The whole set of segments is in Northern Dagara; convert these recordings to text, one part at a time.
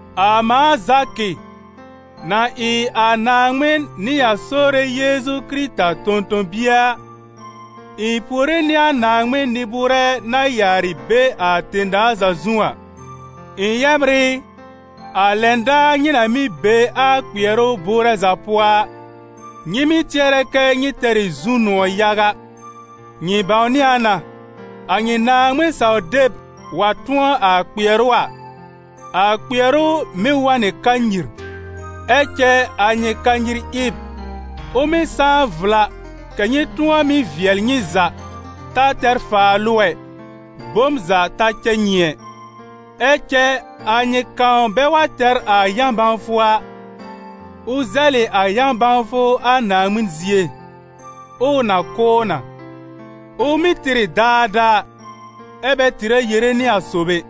A mãa Zakɩ, na ɩ a Naaŋmɩn nɩ a Sore Yeezu Kɩrɩta tõ-tõ-bie a, ɩ̃ puore nɩ a Naaŋmɩn nɩ-bʋʋrɛ na yaarɩ be a tẽ-daa za zu a. Ɩ̃ yɛbr ɩ, a lɛn daar nyɩ na mɩ́ be a kpɩɛrʋ bʋʋrɛ za pʋɔ a, nyɩ mɩ́ tɩɛrɛ kɛ́ nyɩ tɛr ɩ zu-nʋ̃ɔ̀ yaga; nyɩ bãwnɩ a na, a nyɩ Naaŋmɩn-saw-deb wa tʋ̃ɔ a kpɩɛrʋ a, a kpɩɛrʋ mɩ́ wa n nɩ kanyir. Ɛ cɛ a nyɩ kanyir ɩb, ʋ mɩ́ sãá vla kɛ̀ nyɩ tʋ̃ɔ mɩ́ vɩɛl nyɩ za, ta tɛr faalʋ ɛ, bom za ta cɛ nyɩ ɛ. Ɛ cɛ a nyɩ kãw bɛ wa tɛr a yã-bãwfʋ a, ʋ zɛlɩ a yã-bãwfʋ a Naaŋmɩn zie, ʋʋ na kʋ̀ ʋ na; ʋ mɩ́ tɩr ɩ daadaa, ɛ bɛ tɩrɛ yere nɩ a sob ɛ.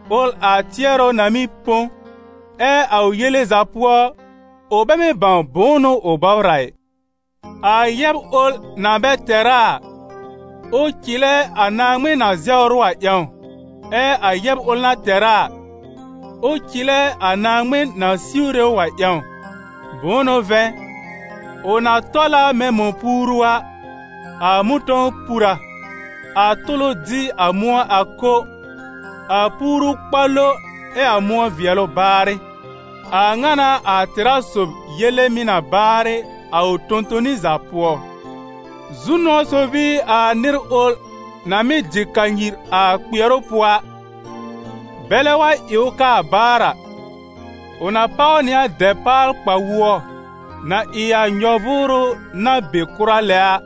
ʋl a tɩɛrʋ na mɩ́ põ, ɛ a ʋ yele za pʋɔ ʋ bɛ mɩ́ bãw bʋ̃ʋ n'ʋ ʋ bɔbr a, i. A yɛb ʋl na bɛ tɛr a a, ʋ cɩlɛ a Naaŋmɩn na zɛwr ʋ a ƴãw, ɛ a yɛb ʋl na tɛr a a, ʋ cɩlɛ a Naaŋmɩn na siwre ʋ a ƴãw. Bʋ̃ʋ n'ʋ vɛ̃, ʋ na tɔl a mɛ̃ mɔ̃-puuru a. A mʋ̃tɔ̃w pur a, a tʋlʋ dɩ a mʋ̃ɔ a ko, a puuru kpa lo ɛ a mʋ̃ɔ vɩɛlʋ baarɩ. A ŋa n'a a tɛ̀rá sob yele mɩ̀ na baarɩ a ʋ tõ-toni za pʋɔ. Zu-nʋ̃ɔ sob ɩ a nɩr ʋl na mɩ́ dɩ kanyir a kpɩɛrʋ pʋɔ a, bɛlɛ wa ɩ ʋ kaa baar a, ʋ na páw nɩ a dɛpaal-kpa-wʋɔ na ɩ a nyɔ-vʋʋrʋ na be kʋra lɛ a,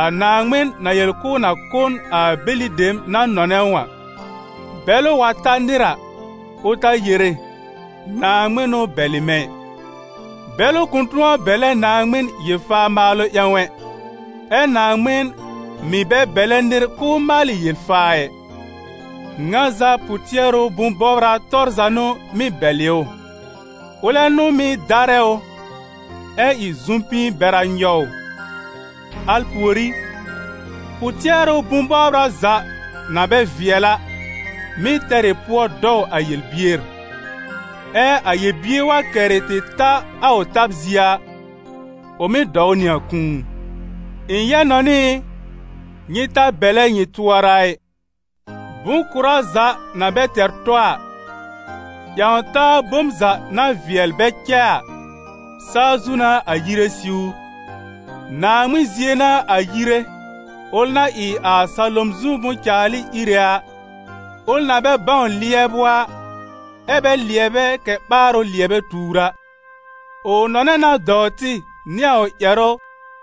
a Naaŋmɩn na yel k'ʋʋ na kʋ̀ n a bɛlɩ dem na nɔnɛ ʋ a. Bɛlʋ wa ta nɩr a, ʋ ta yere: «Naaŋmɩn n'ʋ bɛlɩ mɛ̃ ɩ.» Bɛlʋ kʋ̃ tʋ̃ɔ bɛlɛ Naaŋmɩn yel-faa maalʋ ƴãw ɛ, ɛ Naaŋmɩn mɩ̀ bɛ bɛlɛ nɩr k'ʋʋ maalɩ yel-faa ɩ. Ŋa za pʋ-tɩɛrʋ bʋ̃-bɔbra tɔr za n'ʋ mɩ́ bɛlɩ ʋ, ʋlɛ n'ʋ mɩ́ darɛ ʋ, ɛ ɩ zʋ̀m-pĩi bɛra nyɔw ʋ; al pùorí, pʋ-tɩɛrʋ bʋ̃-bɔbra za na bɛ vɩɛl a, mɩ́ tɛr ɩ pʋɔ dɔw a yel-bier; ɛ a yel-bier wa kɛrɩ tɩ ta a ʋ tab zie a, ʋ mɩ́ dɔw nɩ a kũu. Ɩ̃ yɛb-nɔnɩ ɩ, nyɩ ta bɛlɛ nyɩ tʋɔra ɩ: bʋ̃-kʋ̀rá za na bɛ tɛr tɔ a, ƴãw-taa bom za na vɩɛl bɛ cɛ a, saa zu n'a a yire siwr; Naaŋmɩn zie n'a a yire, ʋl na ɩ a salom zu bʋ̃-caalɩ Íre a, ʋl na bɛ bãw lɩɛbʋ a, ɛ bɛ lɩɛbɛ kɛ̀ ɓaarʋ lɩɛbɛ tuur a. Ʋ nɔnɛ na dɔw tɩ nɩ a ʋ ƴɛrʋ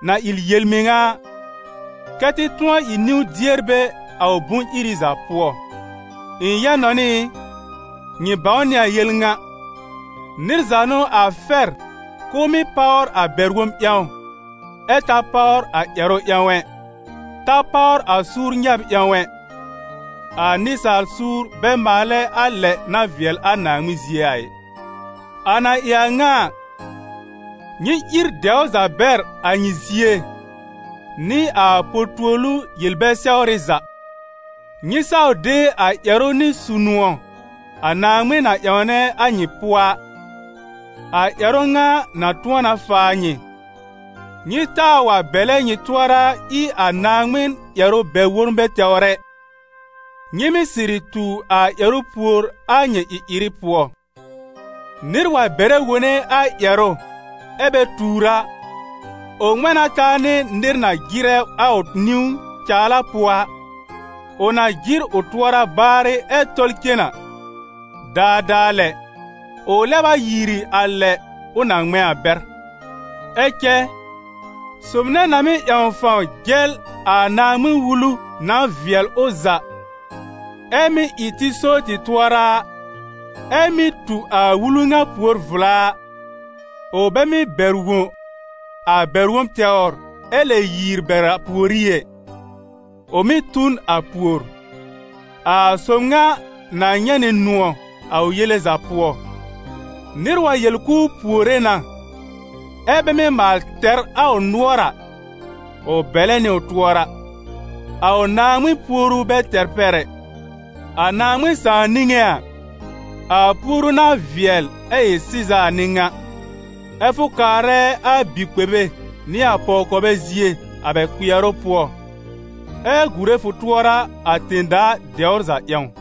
na ɩ a yel-mɩŋa a, kɛ́ tɩ tʋ̃ɔ ɩ niwn-dierbɛ a ʋ bʋ̃-iri za pʋɔ. Ɩ̃ yɛb-nɔnɩ ɩ, nyɩ bãw nɩ a yel ŋa: nɩr za n'ʋ a fɛr k'ʋʋ mɩ́ páwr a bɛr-wob ƴãw, ɛ ta páwr a ƴɛrʋ ƴãw ɛ, ta páwr a suur nyɛb ƴãw ɛ; a nɩsaal suur bɛ maalɛ a lɛ na vɩɛl a Naaŋmɩn zie a ɩ. A na ɩ a ŋa a, nyɩ ír dɛwr za bɛr a nyɩ zie nɩ a po-tuolu yel-bɛ-sɛwrɩ za. Nyɩ saw de a ƴɛrʋ nɩ su-nʋ̃ɔ a Naaŋmɩn na ƴãwnɛ a nyɩ pʋɔ a, a ƴɛrʋ ŋa na tʋ̃ɔ na faa nyɩ. Nyɩ taa waa bɛlɛ nyɩ tʋɔra ɩ a Naaŋmɩn ƴɛrʋ bɛr-wonbɛ tɛwr ɛ; nyɩ mɩ́ sɩrɩ tu a ƴɛrʋ pùor a nyɩ ɩ-ɩrɩ pʋɔ. Nɩr wa bɛrɛ wone a ƴɛrʋ ɛ bɛ tuur a, ʋ ŋmɛ̃ na taa nɩ nɩr na jɩrɛ a ʋ niwn caala pʋɔ a. Ʋ na jɩr ʋ tʋɔra baarɩ ɛ tɔl cen a, daadaa lɛ, ʋ lɛb a yiiri a lɛ ʋ na ŋmɛ̃ a bɛr. Ɛ cɛ sob nɛ na mɩ́ ƴãw fãw jɛl a Naaŋmɩn-Wulu na vɩɛl ʋ za ɛ mɩ́ ɩ tɩ so tɩ tʋɔra a, ɛ mɩ́ tu a wulu ŋa pùor vla a, ʋ bɛ mɩ́ bɛr wõ a bɛr-wob tɛwr ɛ lɛ yiiri bɛr a pùorí ɛ, ʋ mɩ́ tu n a pùor. A sob ŋa na nyɛ̃ nɩ nʋ̃ɔ̀ a ʋ yele za pʋɔ. Nɩr wa yel k'ʋʋ puore na, ɛ́ bɛ mɩ́ maal tɛr a ʋ nʋɔr a, ʋ bɛlɛ nɩ ʋ tʋɔra: a ʋ Naaŋmɩn puoru bɛ tɛr pɛr ɛ. A Naaŋmɩn Sãà niŋé a, a puoru na vɩɛl ɛ ɩ sɩza a n'ɩ ŋa: ɛ́ fʋ kaarɛ a bi-kpebe nɩ a pɔw-kɔbɛ zie a bɛ kpɩɛrʋ pʋɔ, ɛ gùre fʋ tʋɔra a tẽ-daa dɛwr za ƴãw.